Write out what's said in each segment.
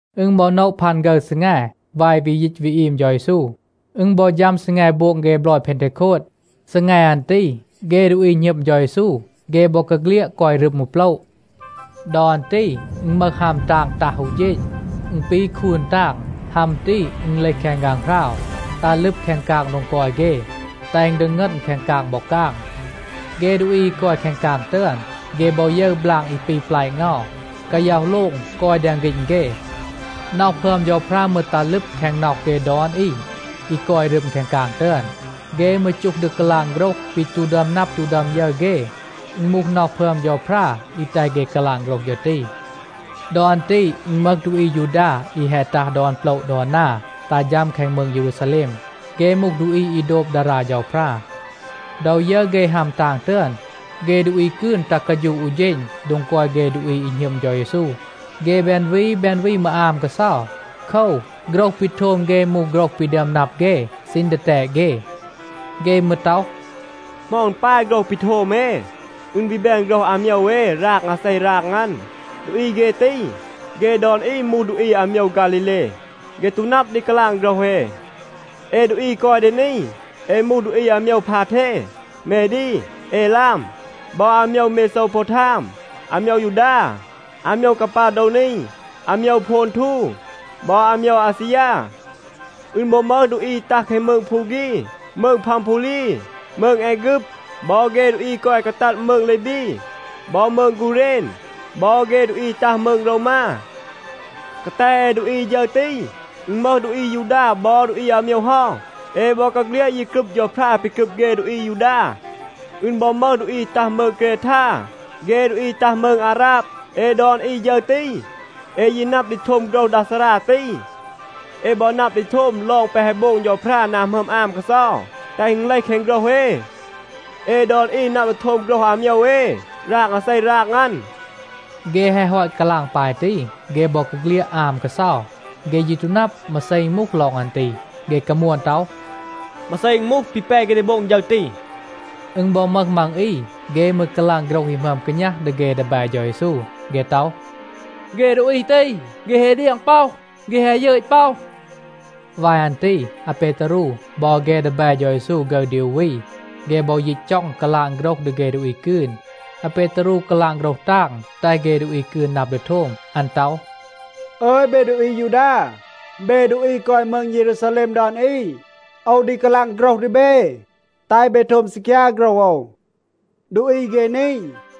อึณ บอ โนะ พัน ฆึร ซีแง วาย วี ยีต วี อีม เฌา เยซู, อึณ บอ ฌัม ซีแง โบง เฆ บลอย เพนเทโคด. ซีแง อัน ตี, เฆ ดูอี หณึม เฌา เยซู, เฆ บอกาเฆลียด กอย รึม อู โปละ. ดอ อัน ตี อึณ มึห ฮัม ตาง ตัห อู เฌณ. อึณ ปี คูน ตาง. ฮัม ตี, อึณ เลห แคง ฆางหราว, ตัห ลึบ แคง กาง โดง กอย เฆ, แตห อึณ ดีงึณ แคง กาง บอ กาง. เฆ ดูอี อี กอย แคง กาง ตึอน, เฆ บอ ยึร บลาง อี ปี แปละ เงา, กาย็อห โลง กอย แดง ฆีณ เฆ. น็อห พึอม เฌาพรา มืร ตัห ลึบ แคง น็อห เฆ ดอน อี, อี กอย รึม แคง กาง ตึอน. เฆ มืร จูห ดี กาลาง โฆรห ปี ตู ดึอม นับ ตู ดึอม ยึร เฆ. อึณ มูห น็อห พึอม เฌาพรา, อี แตห เฆ กาลาง โฆรห ฌึร ตี. ดอ อัน ตี อึณ มึห ดูอี อายูดา อี แฮะ ตัห ดอน โปละ ดอน นา, ตัห ฌัม แคง มืง เยรูซาแลม. เฆ มูห ดูอี อี โดบ ดารา เฌาพรา. ดอ ยึร เฆ ฮัม ตาง ตึอน, เฆ ดูอี กืน ตัห กาฌูะ อู เฌณ โดง กอย เฆ ดูอี อี หณึม เฌา เยซู. เฆ แบน วี แบน วี มืร อาม กาเซา. โคว, โฆรห ปี โทม เฆ มูห โฆรห ปี ดึอม นับ เฆ ซีณ ดีแตด เฆ. เฆ มืร ต็อห, “เหมา อึณ ปาย โฆรห ปี โทม เอ, อึณ วี แบน โฆรห อาโมยว เอ ราง อาเซ ราง อัน. ดูอี เฆ ตี, เฆ ดอน อี มูห ดูอี อาโมยว ฆาลีเล. เฆ ตู นับ ดี กาลาง โฆรห เอ. เอ ดูอี อี กอย ดี นี, เอ มูห ดูอี อาโมยว พาเท, เมดี, เอลาม บอ อาโมยว เมโซวโพวทาม, อาโมยว ยูดา, อาโมยว กาปาโดวนี, อาโมยว โพนทู บอ อาโมยว อาซียา. อึณ บอ มึห ดูอี อี ตัห แคง มืง พูฆี, มืง พัมพูลี, มืง แอฆึบ, บอ เฆ ดูอี อี กอย กาตัด มืง ลีบี บอ มืง กูเรณ, บอ เฆ ดูอี อี ตัห มืง โรวมา. กาแต เอ ดูอี ฌึร ตี, อึณ มึห ดูอี อายูดา บอ ดูอี อาโมยว เฮา. เอ บอกาเฆลียด ยี กรึบ เฌาพรา ปี กรึบ เฆ ดูอี อายูดา. อึณ บอ มึห ดูอี ตัห มืง เกรทา เฆ ดูอี ตัห มืง อาราบ. เอ ดอน อี ฌึร ตี, เอ ยี นับ ดี โทม โฆรห ดา ซารา ตี. เอ บอ นับ ดี โทม ลอง แปะ แฮะ โบง เฌาพรา นา หมึอม อาม กาเซา, แตห อึณ เลห แคง โฆรห เอ. เอ ดอน อี นับ ดี โทม โฆรห อาโมยว เอ ราง อาเซ ราง อัน.” เฆ แฮะ ฮอต กาลาง ปาย ตี, เฆ บอกาเฆลียด อาม กาเซา. เฆ ยี ตู นับ มาเซ อึณ มูห ลอง อัน ตี. เฆ กามวน ต็อห, “มาเซ อึณ มูห, ปี แป เฆ ดี โบง ฌึร ตี?” อึณ บอ มึห มัง อี, เฆ มืร กาลาง โฆรห อี หมึอม กาณัห ดี เฆ ดีแบ เฌา เยซู. เฆ ต็อห, “เฆ ดูอี ตี, เฆ แฮะ เดียง ป็อห, เฆ แฮะ ยึต ป็อห.” วาย อัน ตี อาเปตารู บอ เฆ ดีแบ เฌา เยซู ฆึร ดี อู วี, เฆ บอ ยีต จ็อง กาลาง โฆรห ดี เฆ ดูอี กืน. อาเปตารู กาลาง โฆรห ตาง, แตห เฆ ดูอี กืน นับ ดี โทม. อัน ต็อห, “อึย, เบ ดูอี อายูดา, เบ ดูอี กอย มืง เยรูซาแลม ดอน อี, โอว ดี กาลาง โฆรห ดี เบ, แตห เบ โทม ซีคยา โฆรห โอว. ดูอี เฆ นี,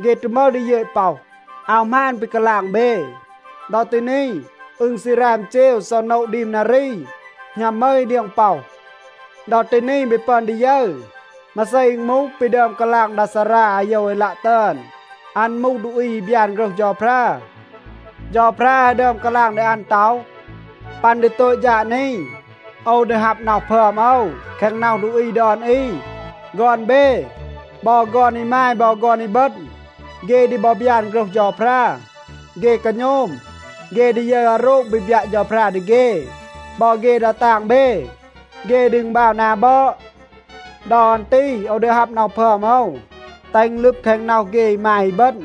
เฆ ตู มึห ดี ยึต ป็อห. อาว หมาน ปี กาลาง เบ. ดอ ตี นี, อึณ ซี ราม เจว ซอะ โนะ ดีม นารี, หณัม มึห อี เดียง ป็อห. ดอ ตี นี เบ ปึอน ดี ยึร, มาเซ อึณ มูห, ปี ดึอม กาลาง ดา ซารา อาโยวเอลัะ ตึอน. อัน มูห ดูอี อี บยาน โฆรห เฌาพรา. เฌาพรา แฮะ ดึอม กาลาง ดี อัน ต็อห, ‘ปัน ดี โตต ฌาด นี, โอว ดี ฮับ น็อห พึอม โอว, แคง น็อห ดูอี ดอน อี. ฆอน เบ, บอ ฆอน อีมาย บอ ฆอน อีบึณ, เฆ ดี บอ บยาน โฆรห เฌาพรา. เฆ กาโณม, เฆ ดี ยึร อาโรง ปี บยัะ เฌาพรา ดี เฆ. บอ เฆ ดา ตาง เบ, เฆ ดี อึณบาว นา บอด. ดอ อัน ตี โอว ดี ฮับ น็อห พึอม โอว, แตห อึณ ลึบ แคง น็อห เฆ อีมาย อีบึณ,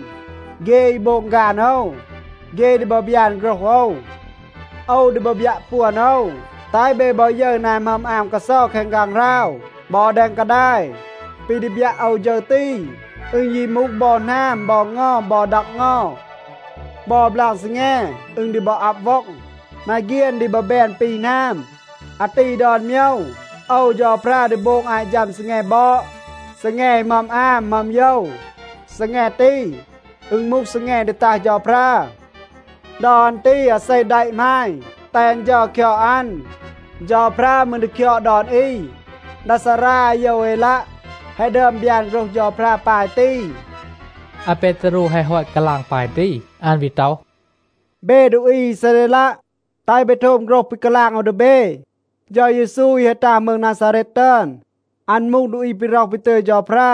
เฆ อี โบง ฆาน โอว. เฆ ดี บอ บยาน โฆรห โอว. โอว ดี บอ บยัะ ปวน โอว, แตห เบ บอ ยึร นา หมึอม อาม กาเซา แคง ฆางหราว บอ แดง กาดาย. ปี ดี บยัะ โอว ฌึร ตี, อึณ ยี มูห บอ หนาม บอ เงา บอ ดัก เงา. บอ บลาง ซีแง, อึณ ดี บอ อับ ว็อง. มาเฆียน ดี บอ แบน ปี หนาม. อาตี ดอน โมยว โอว เฌาพรา ดี โบง อาต ฌัม ซีแง บอด, ซีแง อี หมึอม อาม, หมึอม โยว. ซีแง ตี, อึณ มูห ซีแง ดี ตัห เฌาพรา. ดอ อัน ตี อาเซ แดะ หมาณ, แตห อัน เฌา คยอด อัน, เฌาพรา มืร ดี คยอด ดอน อี.’ ดา ซารา อาโยวเอลัะ แฮะ ดึอม บยาน โฆรห เฌาพรา ปาย ตี.” อาเปตารู แฮะ ฮอต กาลาง ปาย ตี, อัน วี ต็อห, “เบ ดูอี อีซาเรลัะ, แตห เบ โทม โฆรห ปี กาลาง โอว ดี เบ. เฌา เยซู อี แฮะ ตัห มืง นาซาเรต ตึอน, อัน มูห ดูอี ปี ร็อห ปี ตึย เฌาพรา.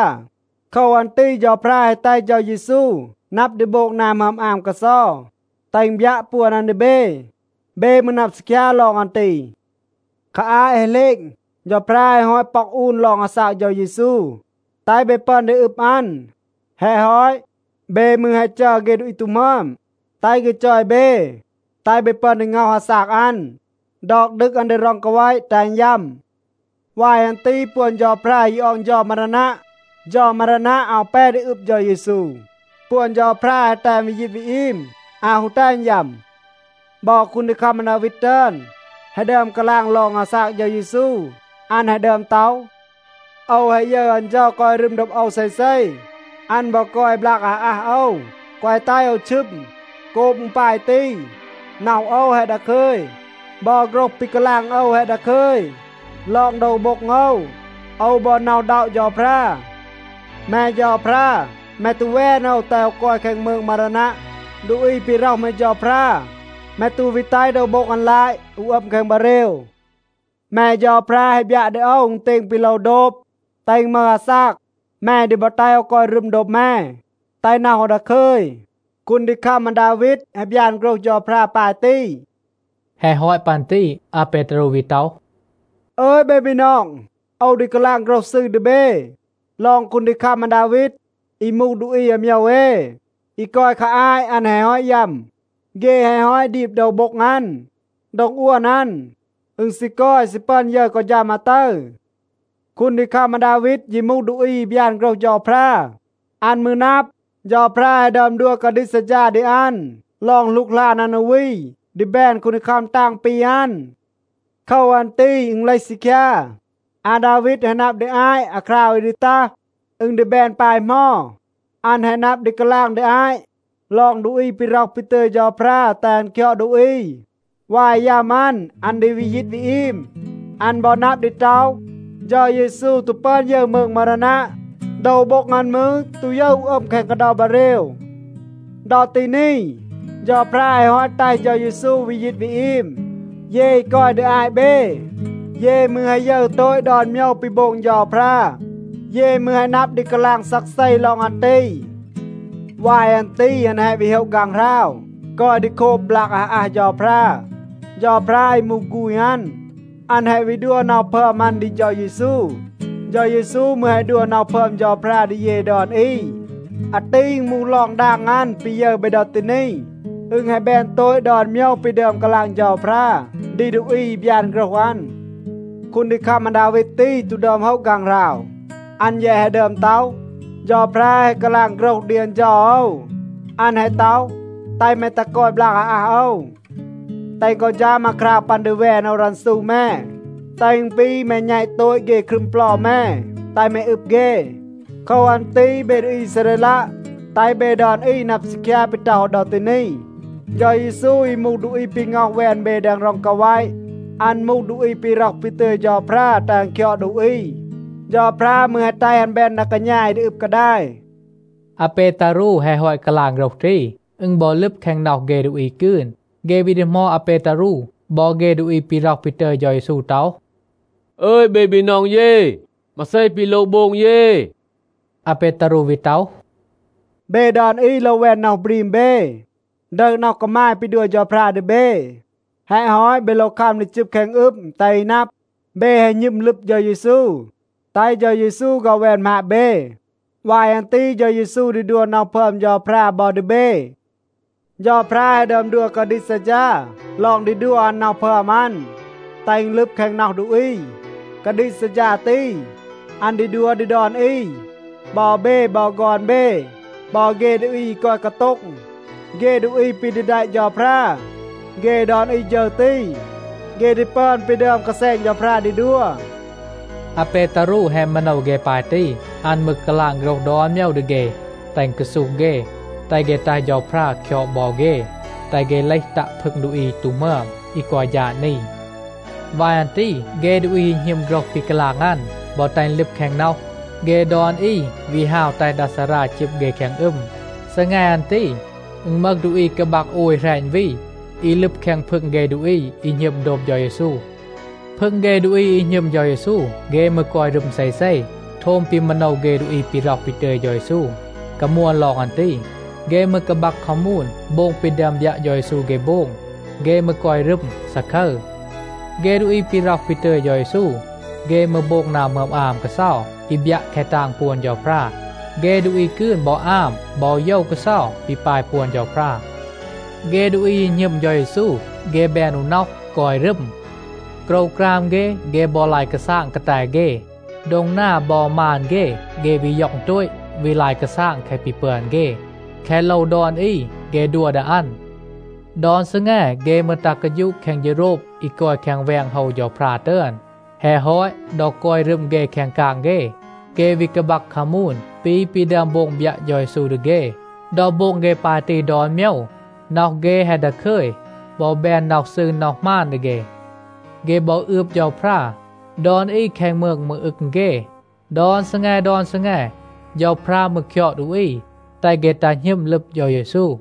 โคว อัน ตี เฌาพรา แฮะ แตห เฌา เยซู นับ ดี โบง นา หมึอม อาม กาเซา, แตห อึณ บยัะ ปวน อัน ดี เบ. เบ มืร นับ ซีคยา ลอง อัน ตี. คา อาต แฮะ เหลณ, เฌาพรา แฮะ ฮอต ป็อก อูน ลอง อาซาก เฌา เยซู, แตห เบ ปึอน ดี อึบ อัน. แฮะ ฮอต, เบ มืร แฮะ จัร เฆ ดูอี ตู หมึอม, แตห เฆ จอย เบ, แตห เบ ปึอน ดี ง็อห อาซาก อัน, ดอก ดึก อัน ดี ร็อง กาแวะ, แตห อัน ยัม. วาย อัน ตี ปวน เฌาพรา ยี ออง เฌา มารานัะ. เฌา มารานัะ อาว แป ดี อึบ เฌา เยซู. ปวน เฌาพรา แฮะ แตห อัน วี ยีต วี อีม, อาว ฮู แตห อัน ยัม. บอ คูนดีคัม อาดาวีด ตึอน แฮะ ดึอม กาลาง ลอง อาซาก เฌา เยซู. อัน แฮะ ดึอม ต็อห, ‘โอว แฮะ ยึร อัน เฌา กอย รึม โดบ โอว เซเซ. อัน บอ กอย บลาก อาอัห โอว, แกวะ แตห โอว ชึม. โกบ อึณ ปาย ตี, น็อห โอว แฮะ ดาคึย. บอ โฆรห ปี กาลาง โอว แฮะ ดาคึย. ลอง โดว โบ็ง โอว, โอว บอ หน็อะ อึณด็อะ เฌาพรา. แม เฌาพรา แม ตู แวน โอว แตห โอว กอย แคง มืง มารานัะ. ดูอี ปี ร็อห แม เฌาพรา, แม ตู วี แตห โดว โบ็ง อัน ลาต, อูห อัม แคง บาเรว. แม เฌาพรา แฮะ บยัะ ดี โอว อึณเตณ ปี โลว โดบ, แตห อึณ มึห อาซาก. แม ดี บอ แตห โอว กอย รึม โดบ แม, แตห น็อห โอว ดาคึย.’ คูนดีคัม อาดาวีด แฮะ บยาน โฆรห เฌาพรา ปาย ตี.” แฮะ ฮอต ปัน ตี อาเปตารู วี ต็อห, “อึย, เบ บีนอง, โอว ดี กาลาง โฆรห ซืร ดี เบ ลอง คูนดีคัม อาดาวีด อี มูห ดูอี อาโมยว เอ, อี กอย คา อาต อัน แฮะ ฮอต ยัม. เฆ แฮะ ฮอต ดีบ โดว โบ็ง อัน. โดง อวน อัน, อึณ ซี กอย, ซี ปึอน ยึร กอ ฌัม อาตึร. คูนดีคัม อาดาวีด ยี มูห ดูอี อี บยาน โฆรห เฌาพรา. อัน มืร นับ, เฌาพรา แฮะ ดึอม ดัว กาดีก ซัดฌา ดี อัน ลอง หลูกหลาน อัน อู วี ดี แบน คูนดีคัม ตาง ปี อัน. โคว อัน ตี อึณ เลห ซีคยา, อาดาวีด แฮะ นับ ดี อาต อาคราว อี ดี ตัห, อึณ ดี แบน ปาย เหมา. อัน แฮะ นับ ดี กาลาง ดี อาต ลอง ดูอี ปี ร็อห ปี ตึย เฌาพรา แตห อัน คยอด ดูอี. วาย ยัม อัน, อัน ดี วี ยีต วี อีม. อัน บอ นับ ดี ต็อห, เฌา เยซู ตู ปึอน ยึร มืง มารานัะ. โดว โบ็ง อัน มืร ตู ยึร อูห อัม แคง กาเดา บาเรว. ดอ ตี นี, เฌาพรา แฮะ ฮอต แตห เฌา เยซู วี ยีต วี อีม. เย อี กอย ดี อาต เบ, เย มืร แฮะ ยึร โตต ดอน โมยว ปี โบง เฌาพรา. เย มืร แฮะ นับ ดี กาลาง ซักเซ ลอง อัน ตี. วาย อัน ตี อัน แฮะ วี โฮะ ฆางหราว, กอย ดี โคบ บลาก อาอัห เฌาพรา. เฌาพรา อี มูห ฆูณ อัน, อัน แฮะ วี ดัว น็อห พึอม อัน ดี เฌา เยซู. เฌา เยซู มืร แฮะ ดัว น็อห พึอม เฌาพรา ดี เย ดอน อี. อาตี อึณ มูห ลอง ดาง อัน, ปี ยึร เบ ดอ ตี นี. อึณ แฮะ แบน โตต ดอน โมยว ปี ดึอม กาลาง เฌาพรา ดี ดูอี อี บยาน โฆรห อัน. คูนดีคัม อาดาวีด ตี ตู ดึอม โฮะ ฆางหราว. อัน แยะ แฮะ ดึอม ต็อห, ‘เฌาพรา แฮะ กาลาง โฆรห ดี อัน เฌา โอว. อัน แฮะ ต็อห, “แตห แม ตัห กอย บลาก อาอัห โอว. แตห กอ ฌัม อาคราว ปัน ดี แวน โอว รันซู แม, แตห อึณ ปี แม แณต โตต เฆ ครึม เปลา แม, แตห แม อึบ เฆ.”’ โคว อัน ตี เบ ดูอี อีซาเรลัะ, แตห เบ ดอน อี นับ ซีคยา ปี ต็อห โอว ดอ ตี นี. เฌา เยซู อี มูห ดูอี ปี ง็อห แวน เบ แดง ร็อง กาแวะ, อัน มูห ดูอี ปี ร็อห ปี ตึย เฌาพรา แตห อัน คยอด ดูอี. เฌาพรา มืร แฮะ แตห อัน แบน ดา กาณา อี ดี อึบ กาดาย.” อาเปตารู แฮะ ฮอต กาลาง โฆรห ตี, อึณ บอ ลึบ แคง น็อห เฆ ดูอี กืน. เฆ วี ดีหมอด อาเปตารู บอ เฆ ดูอี ปี ร็อห ปี ตึย เฌา เยซู ต็อห, “อึย เบ บีนอง เย, มาเซ ปี โลว โบง เย?” อาเปตารู วี ต็อห, “เบ ดอน อี โลว แวน น็อห บรีม เบ, ดึห น็อห กามาย ปี ดัว เฌาพรา ดี เบ. แฮะ ฮอต, เบ โลว คัม ดี จึบ แคง อึม, แตห อี นับ, เบ แฮะ หณึม ลึบ เฌา เยซู, แตห เฌา เยซู ฆ็อห แวน หมาบ เบ. วาย อัน ตี เฌา เยซู ดี ดัว น็อห พึอม เฌาพรา บอ ดี เบ.a เฌาพรา แฮะ ดึอม ดัว กาดีก ซัดฌา ลอง ดี ดัว อัน น็อห พึอม อัน, แตห อึณ ลึบ แคง น็อห ดูอี. กาดีก ซัดฌา ตี, อัน ดี ดัว ดี ดอน อี. บอ เบ, บอ ฆอน เบ, บอ เฆ ดูอี อี กอย กาโต็ง, เฆ ดูอี ปี ดี แดะ เฌาพรา, เฆ ดอน อี ฌึร ตี, เฆ ดี ปึอน ปี ดึอม กาแซณ เฌาพรา ดี ดัว.” อาเปตารู แฮะ มาโนว เฆ ปาย ตี. อัน มืร กาลาง โฆรห ดอน โมยว ดี เฆ, แตห อึณ กาซูห เฆ, แตห เฆ แตห เฌาพรา คยอด บอ เฆ, แตห เฆ เลห ตัะ พึง ดูอี อี ตู หมึอม, อี กอย ฌาด นี. วาย อัน ตี เฆ ดูอี อี หณึม โฆรห ปี กาลาง อัน, บอ แตห อึณ ลึบ แคง น็อห, เฆ ดอน อี วี ฮาว แตห ดา ซารา จึบ เฆ แคง อึม. ซีแง อัน ตี, อึณ มึห ดูอี กาบัก โอย แหรณ วี, อี ลึบ แคง พึง เฆ ดูอี อี หณึม โดบ เฌา เยซู. พึง เฆ ดูอี อี หณึม เฌา เยซู, เฆ มืร กอย รึม เซเซ, โทม ปี มาโนว เฆ ดูอี ปี ร็อห ปี ตึย เฌา เยซู, กามวน ลอง อัน ตี. เฆ มืร กาบัก คามูน, โบง ปี ดึอม บยัะ เฌา เยซู เฆ โบง. เฆ มืร กอย รึม, ซาคึร. เฆ ดูอี ปี ร็อห ปี ตึย เฌา เยซู, เฆ มืร โบง นา หมึอม อาม กาเซา อี บยัะ แคะ ตาง ปวน เฌาพรา. เฆ ดูอี กืน บอ อาม บอ โยว กาเซา ปี ปาย ปวน เฌาพรา. เฆ ดูอี อี หณึม เฌา เยซู, เฆ แบน อู น็อห, กอย รึม. โกรวกราม เฆ, เฆ บอ ลาย กาซาง กาแต เฆ. โดง นา บอ มาน เฆ, เฆ วี ย็อง โตต, วี ลาย กาซาง แคะ ปี ปึอน เฆ. แคะ โลว ดอน อี, เฆ ดัว ดี อัน. ดอน ซีแง เฆ มืร ตัห กาฌูะ แคง เฌโรบ อี กอย แคง แวง โฮว เฌาพรา ตึอน. แฮะ ฮอต, ดอ กอย รึม เฆ แคง กาง เฆ, เฆ วี กาบัก คามูน ปี ปี ดึอม โบง บยัะ เฌา เยซู ดี เฆ. ดอ โบง เฆ ปาย ตี ดอน โมยว, น็อห เฆ แฮะ ดาคึย บอ แบน น็อห ซืร, น็อห หมาน ดี เฆ. เฆ บอ อืบ เฌาพรา. ดอน อี แคง มืง มืร อึง เฆ. ดอน ซีแง ดอน ซีแง, เฌาพรา มืร คยอด ดูอี แตห เฆ ตัห หณึม ลึบ เฌา เยซู.